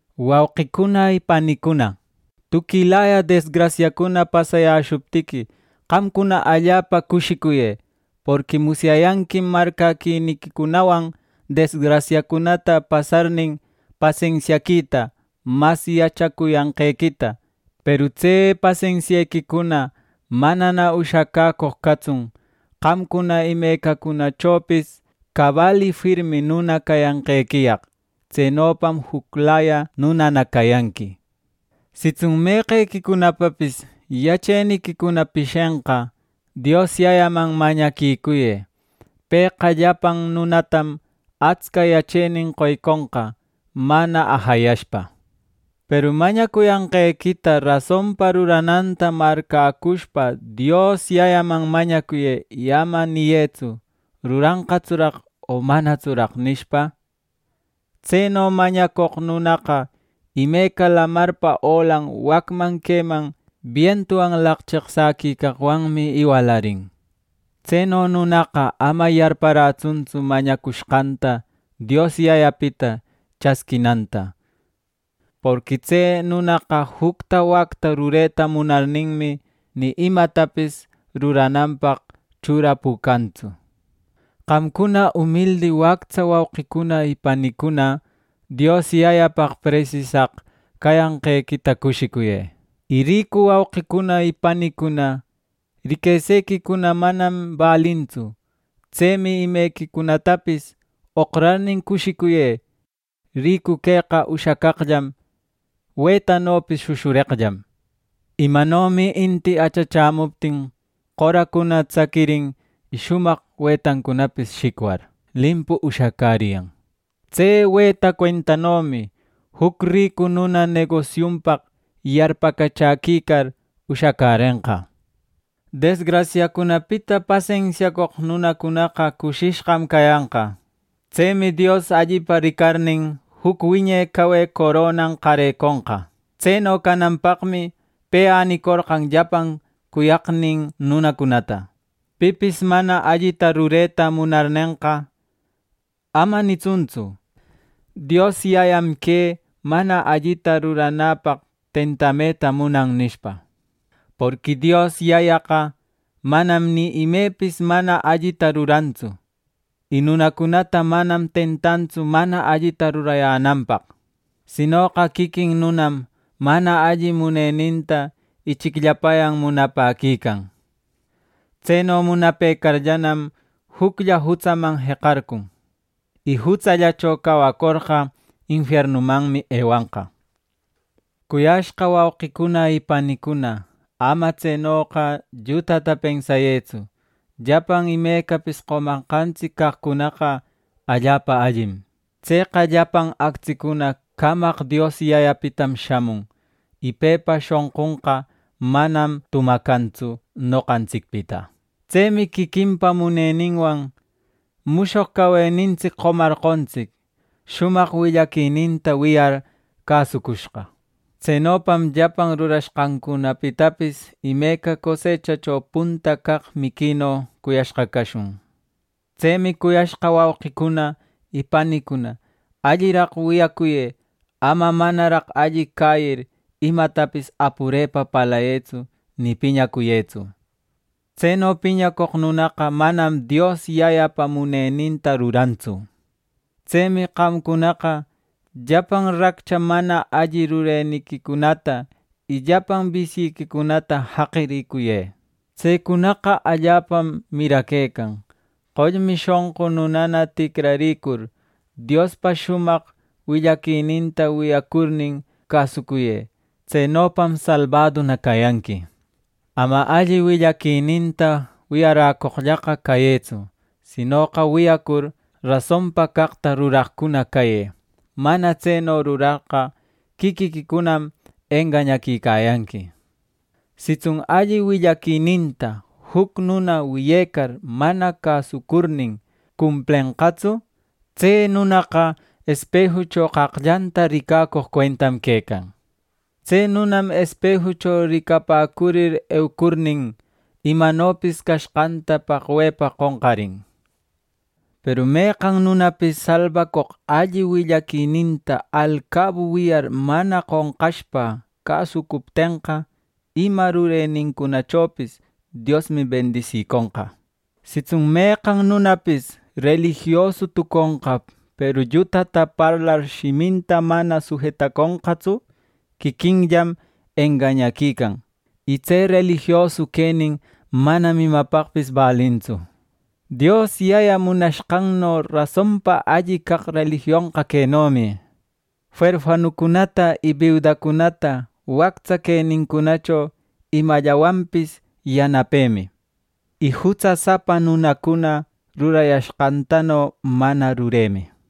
Wauqicuna panicuna, tuquilaya desgrasiacuna pasayäshuptiqui, qamcuna allapa cushicuyë. Porqui musyayanquim marcäquiniquicunawan desgrasiacunata pasarnin, pasensiaquita mas yachacuyanqequita; peru tse pasensiequicuna manana ushacäcoq catsun, qamcuna imecacunachopis cabal y firmi nuna cayanqequiyaq. Tsenopam juclaya nunana cayanqui. Sitsun meqequicunapapis yacheniquicuna pishenqa, Dios Yayaman mañaquicuyë. Pëqa llapan nunatam atsca yachenin qoyconqa, mana ajayashpa; peru mañacuyanqequita rasonpa rurananta marcäcushpa, Dios Yayaman mañacuyë. Y ama niyëtsu: “¿Ruranqatsuraq o manatsuraq?” nishpa. Tseno mañacoq nunaqa imeca lamarpa olan wacman queman bientuwan laqcheqsäquicaqwanmi iwalarin. Tseno nunaqa ama yarparätsuntsu mañacushqanta Dios Yayapita chasquinanta. Porqui tse nunaqa jucta wacta rureta munarninmi, ni imatapis rurananpaq churapucantsu. Qamcuna, umildi wactsa wauqicuna y panicuna, Dios Yayapaq presisaq cayanqequita cushicuyë; y ricu wauqicuna y panicuna, riquesequicuna manam balintsu. Tsemi imequicunatapis oqrarnin cushicuyë. Ricu queqa ushacaqllam wetanopis shushureqllam. Imanomi inti achachämuptin qoracuna tsaquirin, y shumaq wetancunapis shicwar, limpu ushacäriyan; tse weta cuentanomi, juc ricu nuna negosiunpaq yarpacachäquicar ushacärenqa. Desgrasiacunapita pasensiacoq nunacunaqa cushishqam cayanqa. Tsemi Dios allipa ricarnin, juc wiñe cawe coronan qareconqa. Tseno cananpaqmi pe änicorqan llapan cuyaqnin nunacunata. Pipis mana allita rureta munarnenqa, ama nitsuntsu: “Dios Yayam que mana allita ruranäpaq tentameta munan” nishpa. Porqui Dios Yayaqa manam ni imepis mana allita rurantsu, y nunacunata manam tentantsu mana allita rurayänanpaq; sinoqa quiquin nunam mana alli muneninta ichicllapayan munapäquican. Tseno munapëcarllanam, juclla jutsaman jeqarcun. Y jutsallacho cawacorqa, infiernumanmi ewanqa. Cuyashqa wauqicuna y panicuna, ama tsenoqa llutata pensayëtsu. Llapan imecapis qomanqantsic caqcunaqa allapa allim. Tseqa llapan actsicuna camaq Dios Yayapitam shamun. Y pepa shonqunqa manam tumacantsu noqantsicpita. Tsemi quiquinpa muneninwan mushoq cawenintsic qomarqontsic, shumaq willaquininta wiyar cäsucushqa. Tsenopam llapan rurashqancunapitapis imeca cosechacho punta caq miquino cuyashqa cashun. Tsemi cuyashqa wauqicuna y panicuna, alliraq wiyacuyë; ama manaraq alli cäyir, imatapis apurepa parlayëtsu ni piñacuyëtsu. Tseno piñacoq nunaqa manam Dios Yayapa muneninta rurantsu. Tsemi qamcunaqa llapan raccha mana alli rureniquicunata y llapan bisyiquicunata jaqiricuyë. Tsecunaqa allapam miraquecan. Qollmi shonqu nunana ticraricur, Diospa shumaq willaquininta wiyacurnin cäsucuyë. Tsenopam salbaduna cayanqui. Ama alli willaquininta wiyaräcoqllaqa cayëtsu; sinoqa wiyacur, rasonpa caqta ruraqcuna cayë. Mana tseno rurarqa, quiquiquicunam engañaquicayanqui. Sitsun alli willaquininta juc nuna wiyecar mana cäsucurnin, cumplenqatsu; tse nunaqa espejucho qaqllanta ricacoq cuentam quecan. Tse nunam espejucho ricapäcurir eucurnin, imanopis cashqanta paqwepa qonqarin. Peru meqan nunapis salbacoq alli willaquininta alcabu wiyar mana qonqashpa cäsucuptenqa, ima rurenincunachopis Diosmi bendisiconqa. Sitsun meqan nunapis relijiosu tuconqa, peru llutata parlar shiminta mana sujetaconqatsu, quiquinllam engañaquican. Y tse relijiosu quenin manam imapaqpis balintsu. Dios Yaya munashqanno rasonpa alli caq relijionqa quenomi: Werfanucunata y biudacunata wactsa quenincunacho imallawanpis yanapemi; y jutsasapa nunacuna rurayashqantano mana ruremi.